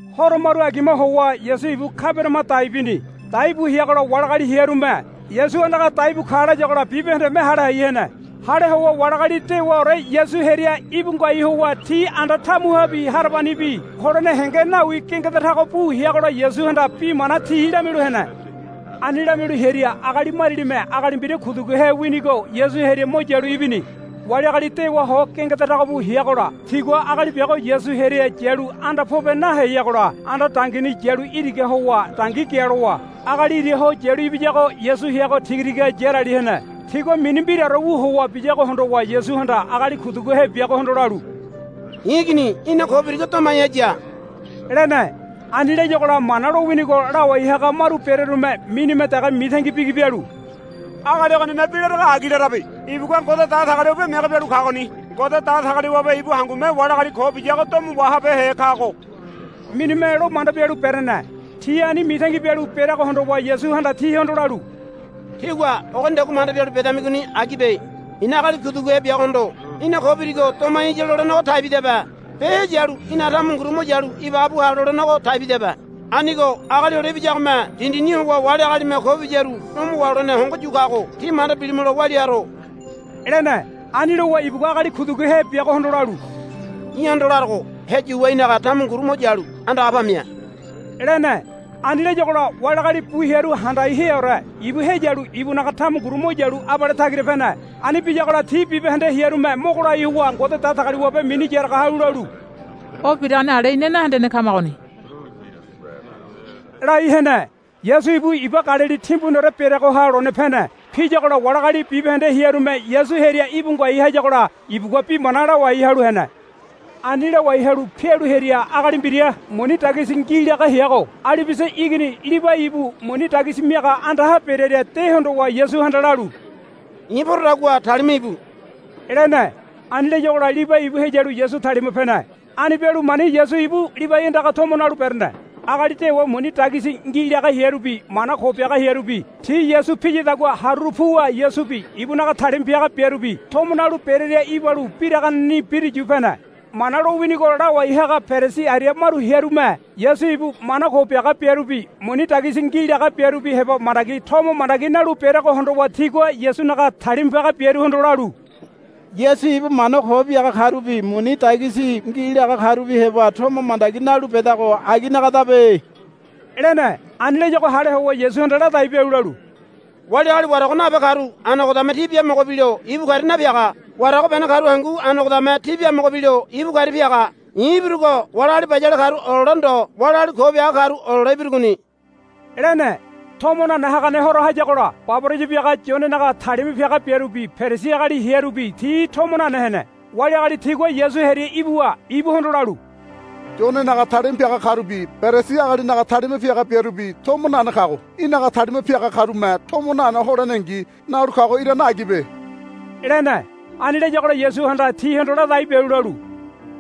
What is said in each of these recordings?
Horo maru agima howa Yasu ibu Kabaniama dai bini. Dai bu heagola wali agali hearume, Yasu andaga daibu ka, layagola bibahendeme hale hai hene. Hale howa wali agali dewaore Yasu hearia íbu ngoai howa ti anda tamuhabi harabanibi holene henge nawi gengeda tago bu heagola Yasuhanda bi mana ti lamialu hene. Ani lamialu hearia agali marialime agali mbira kuduguhe winigo Yasu hearia mo yalu ibini. Wali agali dewa ho gengeda tago bu heagola tigua agali biago Yasu hearia yalu anda pobe naheyagola anda dangini yalu iraga howa dangi gialowa agali ira ho yalu ibiyago Yasu heago tigatiga yarali hene. Tigua mini mbiraore wu howa biyago hondowa Yasuhanda agali kuduguhe biagohondo lalu, I̱ igini í̠na ko birigo domai haya, lene. Ani layagola Mana lowinigo lawai haga maru berearume minime dege mitangi bigi bialu, Agali ogonime bi larago agi larabe. Ibugua Ngode Datagaliwabe mege bialu kagoni. Ngode Datagaliwabe ibu hangume wali agali ko biyago domo wahabehe kago, minime lo manda bialu berene. Ti ani mitangi bialu bereago hondowa Yasuhanda tihondo lalu, Tígua ogonidagua manda bialu bedamigoni agibe. I̱na agali kuduguhe biagohondo, Í̠na ko birigo domai haya, lolenego taibidabe be, Heyalu í̠naga tamunguru mo yalu ibaga bu ha, lolenego taibidabe. Anigo Agali Hole Ibiyagome dindini howa wali agalime ko biyaru domo waholene hongo yu kago tí manda bilimulo walia haro, lene. Ani lowa ibugua agali kuduguhe biagohondo lalu, Í̠hondo larogo, Heyuwa í̠naga tamunguru mo yalu andaga pamia, lene. Ani layagola wali agali bu hearu handai heaore ibu heyalu ibunaga tamunguru mo yalu abale tagira pene. Ani biyagola ti bibahende hearume mogo lai howa Ngode Datagaliwabe mini yaraga halu lalu, O biragoni ale ina nahendene kamagoni, lai hene. Yasu ibu iba Galili timbuniore bereagoha lone pene. Piyagola wali agali bibahende hearume Yasu hearia íbu ngoai hayagola ibugua bi mana lawai halu hene. Ani lawai halu pialu hearia agali mbira muni dagisi ngi laga heago Alibiasa igini Libai ibu muni dagisi miaga andaha berearia de hondowa Yasuhanda lalu, I̱ porodagua talima íbu, lene. Ani layagola Libai ibu heyalu Yasu talima pene. Ani bialu mani Yasu ibu Libai andaga tomo nalu berene. Agali dewa muni dagisi ngi laga hearubi mana ko biaga hearubi ti Yasu piyadagua haruru puwa Yasubi ibunaga talima piaga biarubi tomo nalu berearia ibalu biraganeni biruyu pene. Mana lowinigo lawai haga Perisi aria maru hearume Yasu ibu mana ko biaga biarubi muni dagisi ngi laga biarubi heba mandagi tomo mandagi nalu bereago hondowa tigua Yasunaga talima piaga biaruhondo lalu, Yasu ibu mana ko biaga karubi muni dagisi ngi laga karubi heba tomo mandagi nalu bedago aginagadabe, lene. Ani layago hale howa Yasuhanda ladai bialu lalu, Wali agali warago nabe karu anogodame ti biamogo bilo ibu karia napiaga. Warago bene karu hangu anogodame ti biamogo bilo ibu karia piaga. I̱ ibirugo wali agali bayale karu olole ndo wali agali ko biaga karu olole ibirugoni, lene. Tomo nane hagane horo hayagola baboraya biaga Yonenaga talima piaga biarubi Perisi agali hearubi ti tomo nane hene. Wali agali tigua Yasu hearia ibuwa ibuhondo lalu, Yonenaga talima piaga karubi Perisi agalinaga talima piaga biarubi tomo nane kago. Í̠naga talima piaga karume tomo nane holenengi nalu kago irane agibe, lene. Ani layagola Yasuhanda tihondo ladai bialu lalu,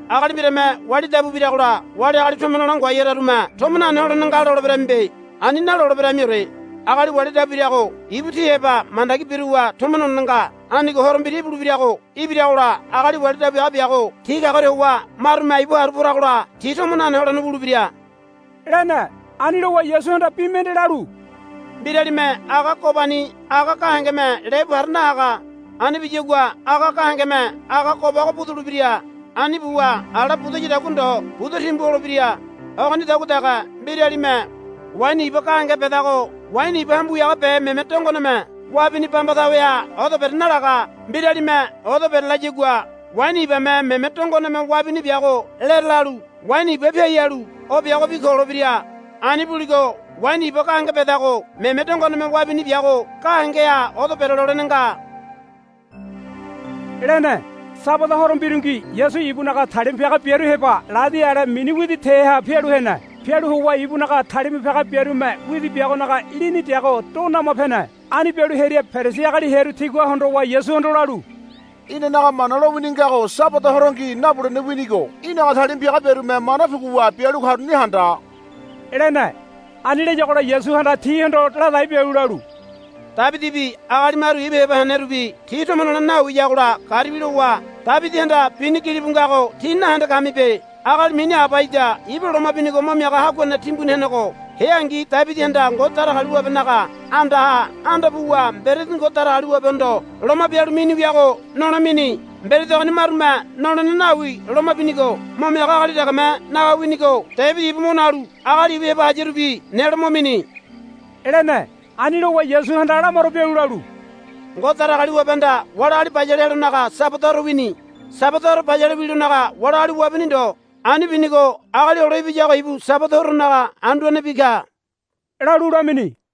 Agali mbirame wali dabu biragola wali agali tomo nole ngoai hararume tomo nane holene nga loleberamibe. Ani naloleberamiore. Agali wali dabu birago ibu ti heba mandagi biruwa tomo nolene nga. Anigo horo mbira ibulebirago ibiragola agali wali dabu biaga biago ti kagoria howa marume ibu haru poragola ti tomo nane holene wulebira, lene. Ani lowa Yasuhanda bi mende lalu, Mbiralime aga gobani aga gahengeme lebu para nahaga. Ani biyagua aga gahengeme aga gobago budulebira. Ani buwa ala budayadagua ndo buda timbu holebira. Ogonidagua dege mbiralime waini iba gahenge bedago waini iba hambu wiaga be meme dongoneme wabini bamba taweha odo bere nalaga. Mbiralime odo berelayagua waini ibame meme dongoneme wabini biago lere lalu waini iba piai halu biagobi ko holebira. Ani buligo waini iba gahenge bedago meme dongoneme wabini biago gahengeha odo berelolene nga, lene. Sabada horo mbirungi Yasu ibunaga talima piaga biaru heba ladi ale mini widi teha pialu hene. Pialu howa ibunaga talima piaga biarume widi biagonaga lini deago do nama pene. Ani bialu hearia Perisi agali hearu tigua hondowa Yasuhondo lalu, Inanaga Mana lowini ngago Sabada horongi nabulene winigo í̠naga talima piaga biarume mana puguwa bialu karuni handa, lene. Ani layagola Yasuhanda tihondo ladai bialu lalu, Debidibi agali maru ibu heba henerubi ti tomo nolene nawiyagola garibi lowa Debidihanda bini gilibu ngago tí nahende kamibe. Agali mini Abaiada ibu loma binigo mo miaga haguane timbuni henego heangi Debidihanda Ngode Datagaliwabenaga andaha anda puwa mberedi Ngode Datagaliwabehondo loma bialu mini wiago nole mini. Mberedi ogoni marume nolene nawi loma binigo mo miaga agali degeme naga winigo Debidi ibu mo nalu agali ibu heba hayarubi nelo mo mini, lene. Ani lowa Yasuhanda lamaro bialu lalu, Ngode Datagaliwabehanda wali agali bayale helonaga Sabada horo wini. Sabada horo bayale wilonaga wali agali wabini ndo. Ani binigo Agali Hole Ibiyago ibu Sabada horonaga Anduanebi ka, lalu lamini.